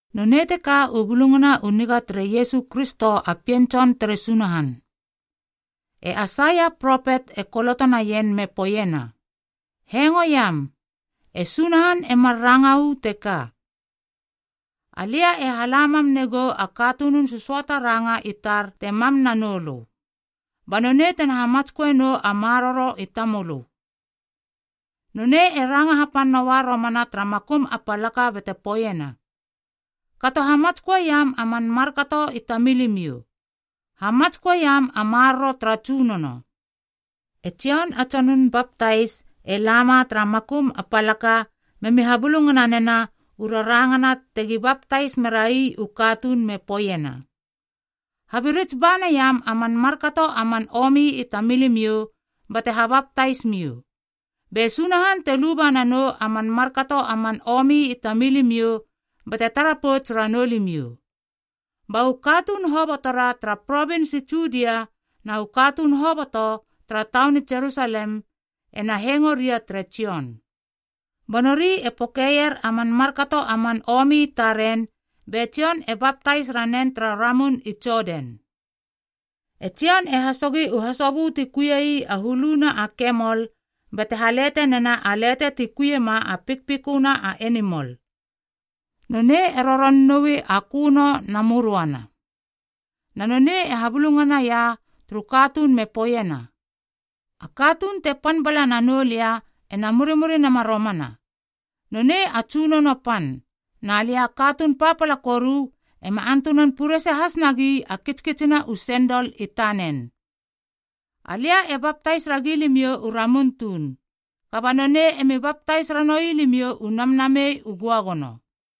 Nonei teka u Bulungana u Niga tere Iesu Kristo a Pien Tson tere Sunahan: E Aisaia a propet e kolotonaien me poeiena, “Hengoiam, e Sunahan e mar ranga uu teka: ‘Alia e hala mam negou a katunun sösöata ranga i tar te mam nanou lö, ba nonei tena hamatsköe nou a maroro i tamölö. Nonei ena ranga hapan noa romana tara makum a palaka bate poeiena, Kato hamatsköeiam a man markato i tamilimiou, hamatsköeiam a maroro tara Tsunono.’” E Jon a tsonun baptais e lama tara makum a palaka memi habulungana nena u rarangana tegi baptais merai u katuun me poeiena, “Habirits ba naiam a man markato a man omi i tamilimiou bate habaptais miou, be Sunahan te luba nanou a man markato a man omi i tamilimiou bate tara pouts ranou limiou.” Ba u katuun hobotora tara provins i Judia na u katuun hoboto tara taun i Jerusalem ena hengo ria tere Jon. Ba nori e pokeier a man markato a man omi i taren be Jon e baptais ranen tara ramun i Jodan. E Jon e hasogi u hasobö ti kuiei a huluna a kemol bate halete nena a lete ti kuiema a pikpiköna a enimol. Nonei e roron noui a köno na möröana. Na nonei e habulungana ia turu katuun me poeiena, “A katuun te pan bala nanou lia ena murimuri nama romana. Nonei a tsunono pan, na lia a katuun papala koru ema antunan purese has nagi a kitskitsina u sendol i tanen. Alia e baptais ragi limiou u ramun tuun, kaba nonei emi baptais ranoui limiou u Namnamei u Göagono.”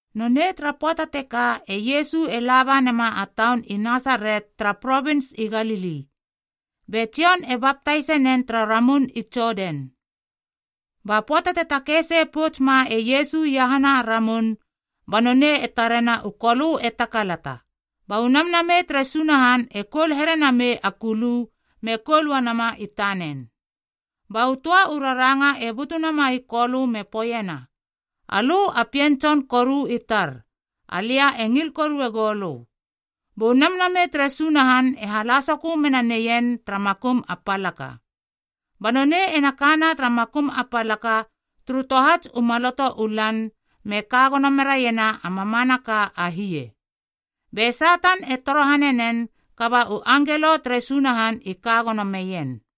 Nonei tara pöata teka e Iesu e laba nema a taun i Nasaret tara provins i Galili, be Jon e baptais e nen tara ramun i Jodan. Ba pöata te takei sei pouts ma e Iesu iahana a ramun ba nonei e tarena u Kolö e takalata, ba u Namnamei tere Sunahan e koul here namei a kulu me koul uanama i tanen. Ba u töa u raranga e butu nama i Kolö me poeiena, “Alö a Pien Tson koru i tar, Alia e ngil korue goulö.” Bu Namnamei tere Sunahan e hala sokö mena neien tara makum a palaka. Ba nonei ena kana tara makum a palaka turu tohats u maloto u lan me ka gono meraiena a mamanaka a hie, be Satan e torohane nen kaba u angelo tere Sunahan i ka gono meien.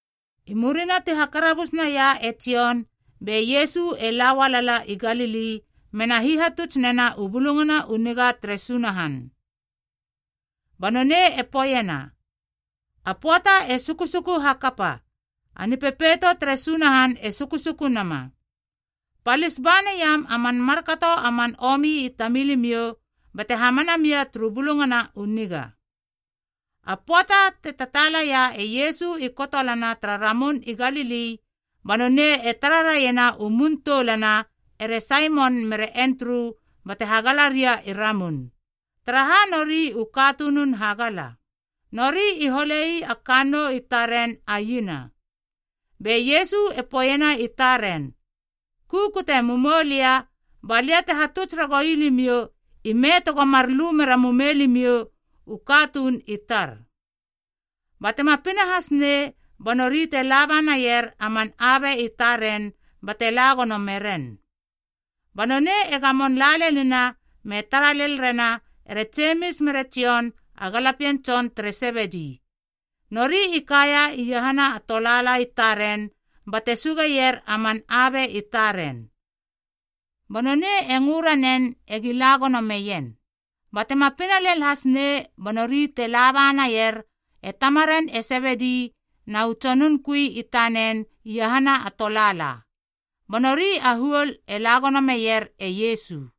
I murina ti hakarabus naia e Jon be Iesu e la ualala i Galili mena hihatuts nena u Bulungana u Niga tere Sunahan. Ba nonei e poeiena, “A pöata e sukusuku hakapa, a nipepeito tere Sunahan e sukusuku nama. Palis ba naiam a man markato a man omi i tamilimiou bate hamana mia turu Bulungana u Niga.” A pöata te tataalaia e Iesu i kotolana tara Ramun i Galili ba nonei e tara raiena u mun toulana ere Saimon mere Endru bate hagala ria i ramun, taraha nori u katunun hagala. Nori i hole ii a kannou i taren a iena. Be Iesu e poeiena i taren, “Kukute mumoulia balia te hatuts ragoui limiou ime tego mar lu mera mumei limiou u katuun i tar.” Ba tema pina hasnei ba nori te laba naier a man abe i taren bate la gono meren. Ba nonei e gamon la lenina me tara lel rena ere Jemis mere Jon a galapien tson tere Sebedi. Nori i kaia iahana a tolaala i taren bate sugeier a man abe i taren. Ba nonei e ngö ranen egi la gono meien. Ba tema pina lel hasnei ba nori te laba naier e tamaren e Sebedi na u tsonun kui tanen iahana a tolaala. Ba nori a huol e la gono meier e Iesu.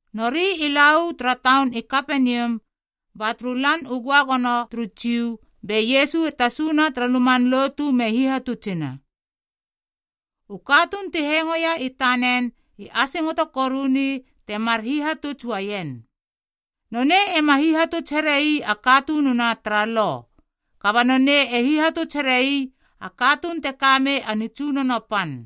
Nori i la uu tara taun i Kapenium ba turu Lan u Göagono turu Jiu, be Iesu e tasuna tara luman lotu me hihatutsina. U katuun ti hengoeia i tanen i asingoto koruni temar hihatuts uaien. Nonei ema hihatuts here ii a katununa tara Lo, kaba nonei e hihatuts here ii a katuun te kamei a nitsunono pan.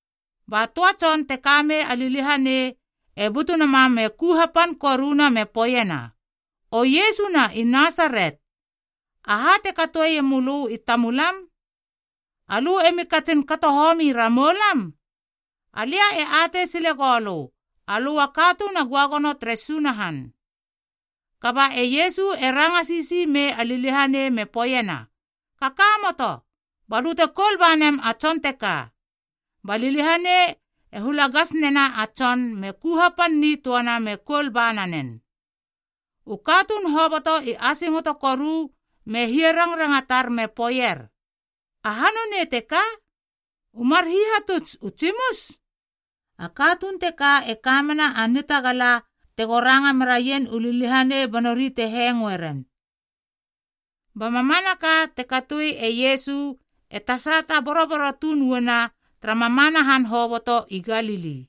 Ba töa tson te ka mei a liliahanei e butunama me ku hapan koruna me poeiena, “O Iesu na i Nasaret. Aha te katoeie mölö i tamulam? Alö emi katsin kato homi ramou lam? Alia e atei sile goulö, alö a Katuun a Göagono tere Sunahan!” Kaba e Iesu e ranga sisi mei a liliahanei me poeiena, “Kakamoto, balö te koul ba nem a tson teka.” Ba liliahanei e hula gas nena a tson me ku hapan nitöana me koul ba nanen. U katuun hoboto i asingoto koru me hia rangrangatar me poeier, “Aha nonei teka? U mar hihatuts u tsimus? A katuun teka e ka mena a nitagala tego ranga meraien u liliahanei ba nori te hengoe ren!” Ba mamanaka te katoi e Iesu e tasata boroboro tuun uana tara mamana han hoboto i Galili.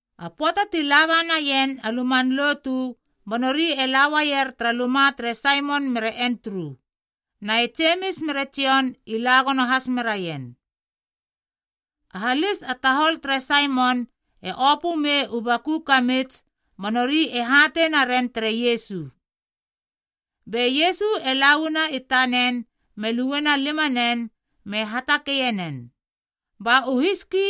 A pöata ti laba naien a luman lotu ba nori e la uaier tara luma tere Saimon mere Endru, na e Jemis mere Jon i la gono has meraien. A halis a tahol tere Saimon e opö mei u baku kamits ba nori e hatei naren tere Iesu. Be Iesu e la uana i tanen me luena limanen me hatakeie nen. Ba u hiski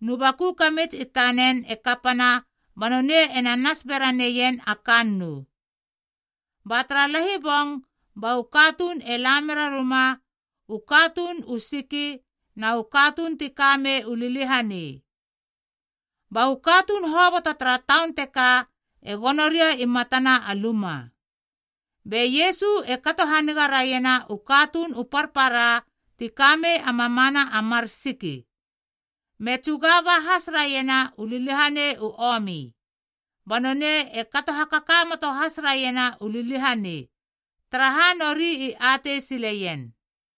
nu baku kamits i tanen e kapana ba nonei ena nas bera neien a kannou. Ba tara lahibong ba u katuun e la mera ruma u katuun u siki na u katuun ti kamei u liliahanei. Ba u katuun hoboto tara taun teka e gono ria i matana a luma. Be Iesu e kato haniga raiena u katuun u parpara ti ka mei a mamana a mar siki, me tsuga ba has raiena u liliahanei u omi. Ba nonei e kato hakakamoto has raiena u liliahanei, taraha nori i atei sileien.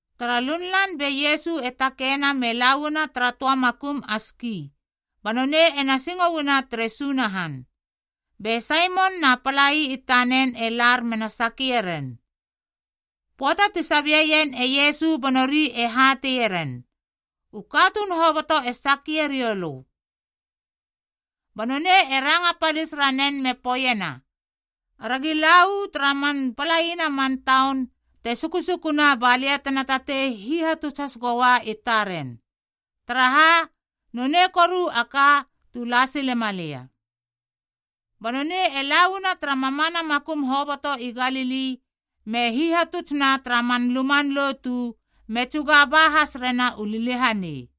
Tara lunlan be Iesu e takeina me la uana tara töa makum a ski, ba nonei ena singo uana tere Sunahan. Be Saimon na palai i tanen e lar mena sakie ren. Pöata ti sabieien e Iesu ba nori e hateie ren, “U katuun hoboto e sake riou lö.” Ba nonei e ranga palis ranen me poeiena, “Aragi la uu tara man palaina a man taun te sukusukuna ba lia tena tatei hihatuts has goua i taren. Taraha, nonei koru a ka tu la silema lia.” Ba nonei e la uana tara mamana makum hoboto i Galili me hihatutsna tara man luman lotu me tsuga ba has rena u liliahanei.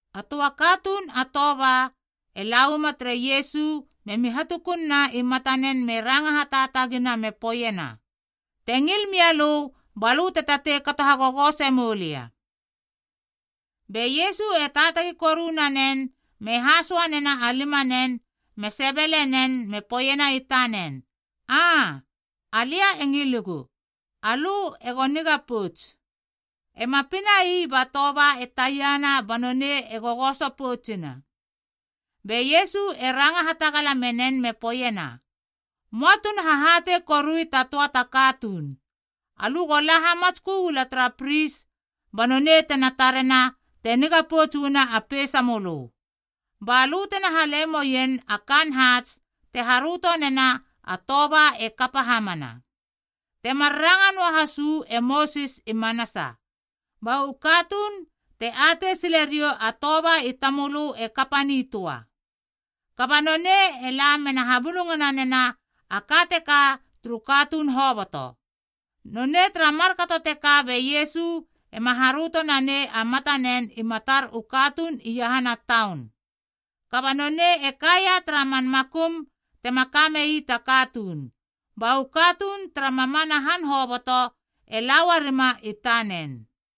A töa katuun a toba e la uama tere Iesu memi hatukunna i matanen me ranga hataatagina me poeiena, “Te ngil mia lö balö te tatei kato hagogose moulia.” Be Iesu e taatagi koru nanen me hasoa nena a limanen me sebele nen me poeiena i tanen, “Aa, alia e ngiligu. Alö ego niga pouts.” Ema pinai ba toba e taiana ba nonei e gogoso poutsina. Be Iesu e ranga hatagala menen me poeiena, “Möa tuna hahatei korui ta töa ta katuun. Alö go la hamatskö uala tara pris ba nonei tena tarena te niga pouts uana a peisamölö. Ba lö tena hale moien a kaan haats te haröto nena a toba e kapa hamana, temar ranga nöa has uu e Mosis i manasa, ba u katuun te atei sile riou a toba i tamölö e kapa nitöa.” Kaba nonei e la mena habulungana nena a ka teka turu katuun hoboto. Nonei tara markato teka be Iesu ema haröto na nei a matanen i matar u katuun iahana taun. Kaba nonei e kaia tara man makum tema kamei ta katuun, ba u katuun tara mamana han hoboto e la uarima i tanen.